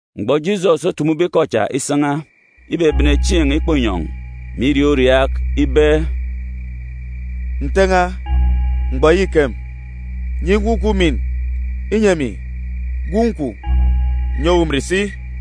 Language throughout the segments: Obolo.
Mgbọ Jisọs otumube ikọ cha isan̄a, ibebene chieen̄ ikpọ inyọn̄, mè iriaak uriaak ibe: “Nte n̄a, mgbọ ya îkem. Nyi emi, Gwun̄ kwun̄, umin, inyi emi, Gwun̄ kwun̄, ǹnyi owu umin si.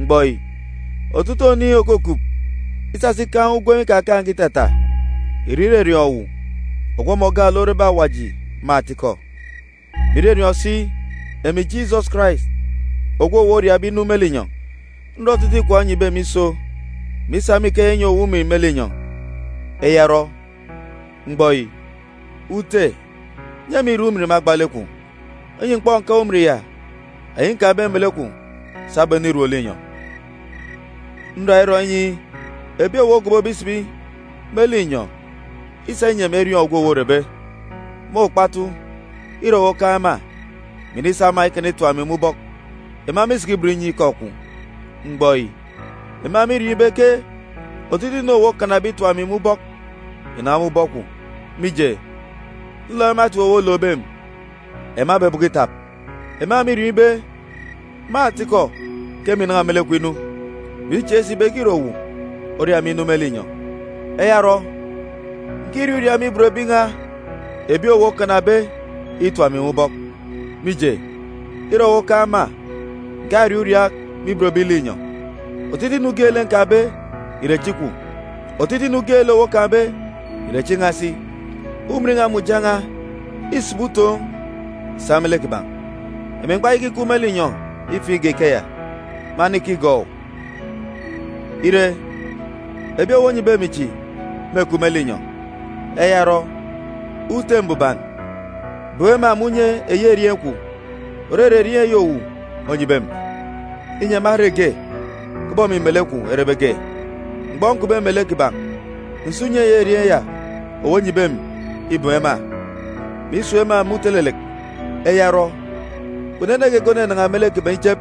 Mgbọ yi, otutuuk oniin̄ òkukup isasa ikaan̄ ugwem ikakaan̄ge itata ìre irọriọọn̄ owu ogwu ọmọ gaalek orebe Awaji me atikọ, mè irọriọọn̄ si emi Jisọs Karais ogwu owu oriabe inu me linyọn̄. Nrọ otutuuk ikwaan̄ onyibe emi iso, mè isa me ikeya inyi owu umin me linyọn̄. Eya orọ, mgbọ yi, Ute, nyi emi irek umin me agba lek kwun̄, inyi m̀kpọk ǹkaan̄ umin ya, eyi nkaan̄be melek kwun̄ sabum enirom linyọn̄. “Nra irọ inyi ebi owu ogobobe isibi me linyọn̄ isa inyi emi eriọọn̄ ogwu owu orebe. Me okpatu, îre owu okaan̄ ema, mè inisa ema ikana itap emi me ubọk. Ema mîsiki ibot inyi ikọ kwun̄. Mgbọ yi, ema mîriọọn̄ ibe ke otutuuk inu owu okanabe itap emi me ubọk ìnan̄a me ubọk kwun̄. Mije, nlook ema etip owu olookbe emi, ema ebọbọkọ itap. Ema mîriọọn̄ ibe, me atikọ, ke emi ǹnan̄a me lek kwun̄ inu, mè ichieek si ibe ke îre owu oria emi inu me linyọn̄. Eya orọ, ǹkiriaak uriaak me ibot ebi n̄a ebi owu okanabe itap emi me ubọk, mije, îre owu okaan̄ ema. Ǹkariaak uriaak me ibot ebi linyọn̄. Otutuuk inu geelek nkaan̄be ìre echi kwun̄. Otutuuk inu geelek owu okaan̄be ìre echi n̄a si. Umin n̄a mè uja n̄a îsibi utoon̄ sa me lek kiban̄. “Emi m̀kpayaka ikup me linyọn̄ ifiin̄ igak ikeya, mânika igọọk owu. Ire, ebi owu onyibe emi chi mêkup me linyọn̄. Eya orọ, Ute Mbuban, bem ema me unye eyi erieen̄ kwun̄, òrere erieen̄ eyi owu onyibe emi, inyi ema ere ge, kubọk emi melek kwun̄ erebe ge. Mgbọ nkupbe melek kiban̄, nsa unye eyi erieen̄ ya owu onyibe emi ibem ema, mè isun̄ ema me utelelek. Eya orọ, kpunu ene geege ònanan̄a me lek kiban̄ ichep,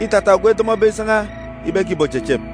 îtata ogwu edọmọbe isan̄a ibe ke ìbochechep,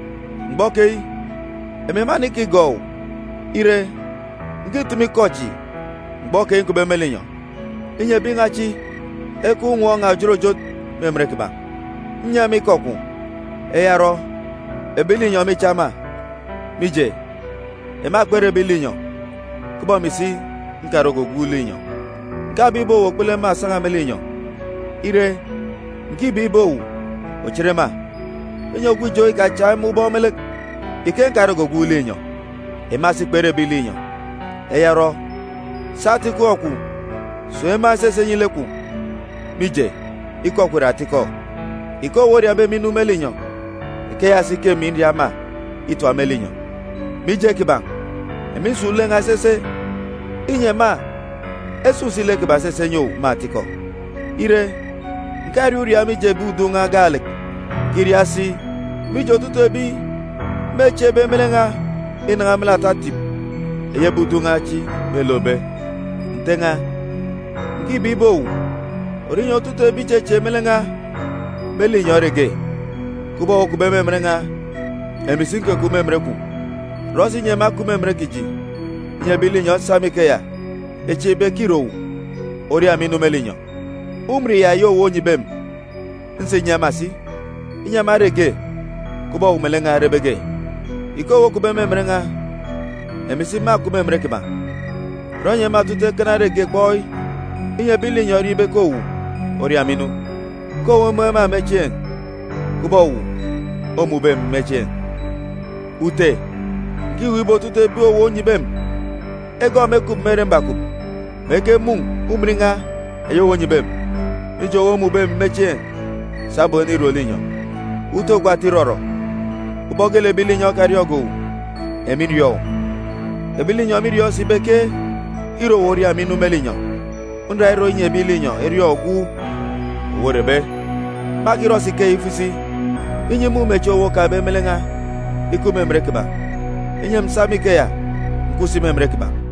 “Mgbọ keyi, emi mânika igọọk owu. Ire, ǹkitumu ikọ chi mgbọ keyi nkupbe me linyọn̄, inyi ebi n̄a chi ekaan̄ unwọọn̄ n̄a òjot òjot me emen kiban̄. Nnyi ema ikọ kwun̄. Eya orọ, ebi linyọn̄ mîcha ema, mije, ema kpere ebi linyọn̄, kubọk emi si nkarege ogwu linyọn̄. “Ǹkabeek ibe owu òkpulu ema òsan̄a me linyọn̄. Ire, ǹkibeek ibe owu òchit ema, inyi ogwu ijo ikachak ema ubọk me lek. Ike nkarege ogwu linyọn̄, ema si kpere ebi linyọn̄. Eya orọ, sa atikọ kwun̄ sun̄ ema esese nyi lek kwun̄, mije, ikọ kwun̄ ìre atikọ. Ike owu oriabe emi inu me linyọn̄, ikeya si ke emi nria ema itap me linyọn̄. Mije kiban̄, emi nsun̄ lek n̄a esese, inyi ema esun̄ si lek kiban̄ esese enyi owu me atikọ. “Ire, ǹkariaak uriaak mije ebi udun̄ n̄a chi gaalek. Ǹkiriaak si mije otutuuk ebi mêchieekbe me lek n̄a inan̄a me lek ata etip eyi ebi udun̄ n̄a chi mêlookbe. Nte n̄a, ǹkibeek ibe owu òrọ inyi otutuuk ebi ìchechieek me lek n̄a me linyọn̄ ere ge, kubọk owu okupbe me emen n̄a, emi si nkukup me emen kwun̄. Rọ si inyi ema ekup me emen kiji, inyi ebi linyọn̄ esa me ikeya echieek ibe ke îre owu oria emi inu me linyọn̄. “Umin ya eyi owu onyibe emi, nsa inyi ema si, inyi ema ere ge, kubọk owu melek n̄a erebe ge. Ike owu okupbe me emen n̄a, emi si mâkup me emen kiban̄. Rọ inyi ema otutuuk ekana ere ge kpọi, inyi ebi linyọn̄ eriọọn̄ ibe ke owu oria emi inu; ke owu omun̄ ema me chieen̄, kubọk owu omun̄be emi me chieen̄. “Ute, ǹkiweek ibe otutuuk ebi owu onyibe emi egọọk emi ekup me ere mbakup, mè ekemun̄ umin n̄a eyi owu onyibe emi, mije owu omun̄be emi me chieen̄ sabum enirom linyọn̄. “Ute ogwu ata irọrọ, ubọk geelek ebi linyọn̄ ekariọọn̄ge owu, emi nriọọn̄ owu. Ebi linyọn̄ mîriọọn̄ si ibe ke îre owu oria emi inu me linyọn̄. Nra irọ inyi ebi linyọn̄ eriọọn̄ ogwu owu orebe, mâkirọ si ikeya ifo isi, inyi imumechieen̄ owu okaan̄be me lek n̄a ikup me emen kiban̄, inyi emi ǹsa me ikeya ǹkup si me emen kiban̄.”